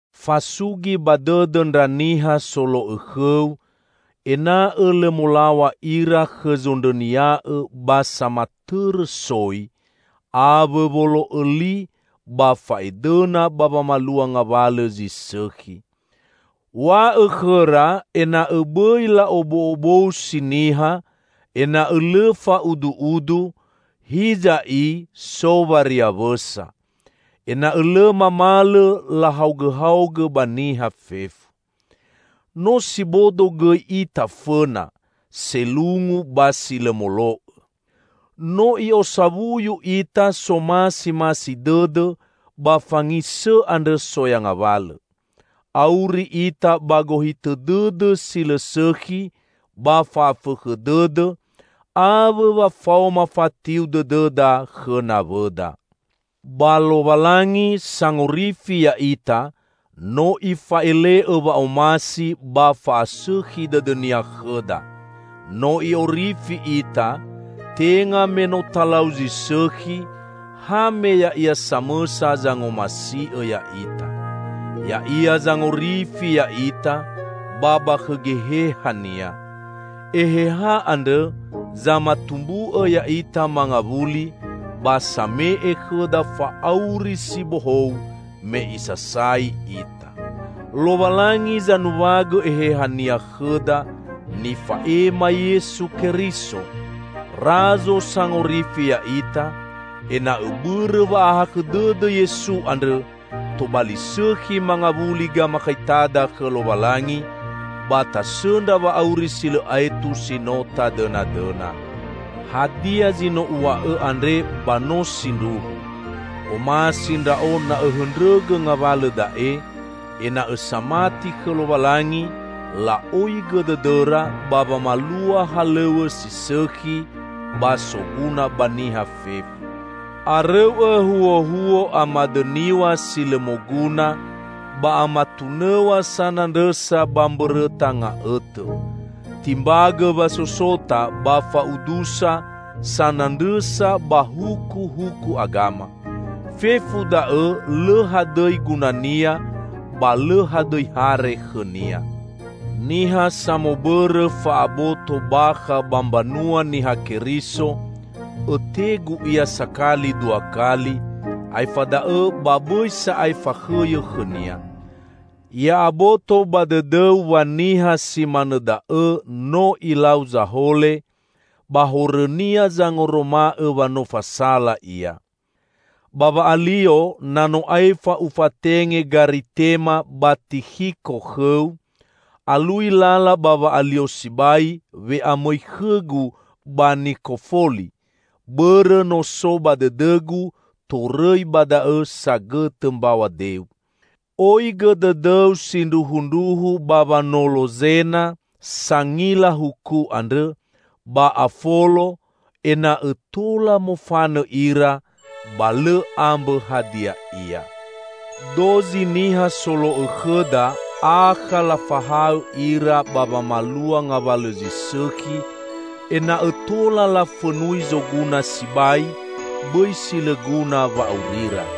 Fasugi ba dõdõ ndra niha solo'õ khõu, ena'õ lõ molaw̃a ira khõ zondrõnia'õ ba samatõrõ soi, awõ wolo'õ li ba fa'edõna ba wamalua ngawalõ zi sõkhi. &Wa'õ khõra ena'õ bõi la'obo'obousi niha, ena'õ lõ fa'udu'udu, hiza i so wariawõsa. Ena'õ lõ mamalõ lahaogõhaogõ ba niha fefu. No si bodo gõi ita fõna, selungu ba si lõ molo'õ. No i'osawuyu ita somasimasi dõdõ ba fangisõ andrõ soya ngawalõ. Auri ita ba gohitõ dõdõ si lõ sõkhi ba fa'afõkhõ dõdõ, awõ wa faoma fatiu dõdõda khõ nawõda. Ba Lowalangi, Sangorifi ya'ita no Ifa'ele'õ wa'omasi ba fa'asõkhi dõdõ-Nia khõda. No I'orifi ita, tenga me no talau zi sõkhi, ha me Ya'ia samõsa zangomasi'õ ya'ita. Ya'ia zangorifi ya'ita ba ba khõ Geheha-Nia. Eheha andrõ, zamatumbu'õ ya'ita mangawuli ba same'e khõda fa'auri si bohou me isasai ita. Lowalangi zanuwagõ Eheha-Nia khõda nifa'ema Yesu Keriso, Razo Sangorifi ya'ita, ena'õ bõrõ wa'ahakhõ dõdõ Yesu andrõ, tobali sõkhi mangawuli gamakhaitada khõ Lowalangi, ba tasõndra wa'auri si lõ aetu si no tadõnadõna. Hadia zi no uw̃a'õ andre ba no sindruhu. Omasi ndra'o na õhõndrõgõ ngawalõ da'e, ena'õ samati khõ Lowalangi la'oigõ dõdõra ba wamalua halõw̃õ si sõkhi ba soguna ba niha fefu. Arõu'õ huohuo amadõniw̃a si lõ moguna ba amatunõw̃a sanandrõsa ba mbõrõta nga'õtõ. Timbagõ wasosota ba fa'udusa sanandrõsa ba hukuhuku agama. Fefu da'õ lõ hadõi gunania ba lõ hadõi hare khõnia. Niha samobõrõ fa'aboto bakha ba mbanua Niha Keriso, õtegu ia sakali dua kali; aefa da'õ ba bõi sa'ae fakhõyõ khõnia. Ya'aboto ba dõdõu wa niha si manõ da'õ no ilau zahole, ba horõnia zangoroma'õ wa no fasala ia. Ba wa'alio na no aefa ufatenge Garitema ba Tikhiko khõu, alui lala ba wa'alio sibai we'amõi khõgu ba Nikofoli, bõrõ no so ba dõdõgu torõi ba da'õ sagõtõ mbaw̃a deu. Oigõ dõdõu sindruhundruhu ba wanolo Zena, sangila huku andrõ, ba Afolo; ena'õ tola mofanõ ira, ba lõ ambõ hadia ia. Dozi niha solo'õ khõda akha lafahaõ ira ba wamalua ngawalõ zi sõkhi, ena'õ tola lafõnui zoguna sibai; bõi si lõ guna wa'aurira.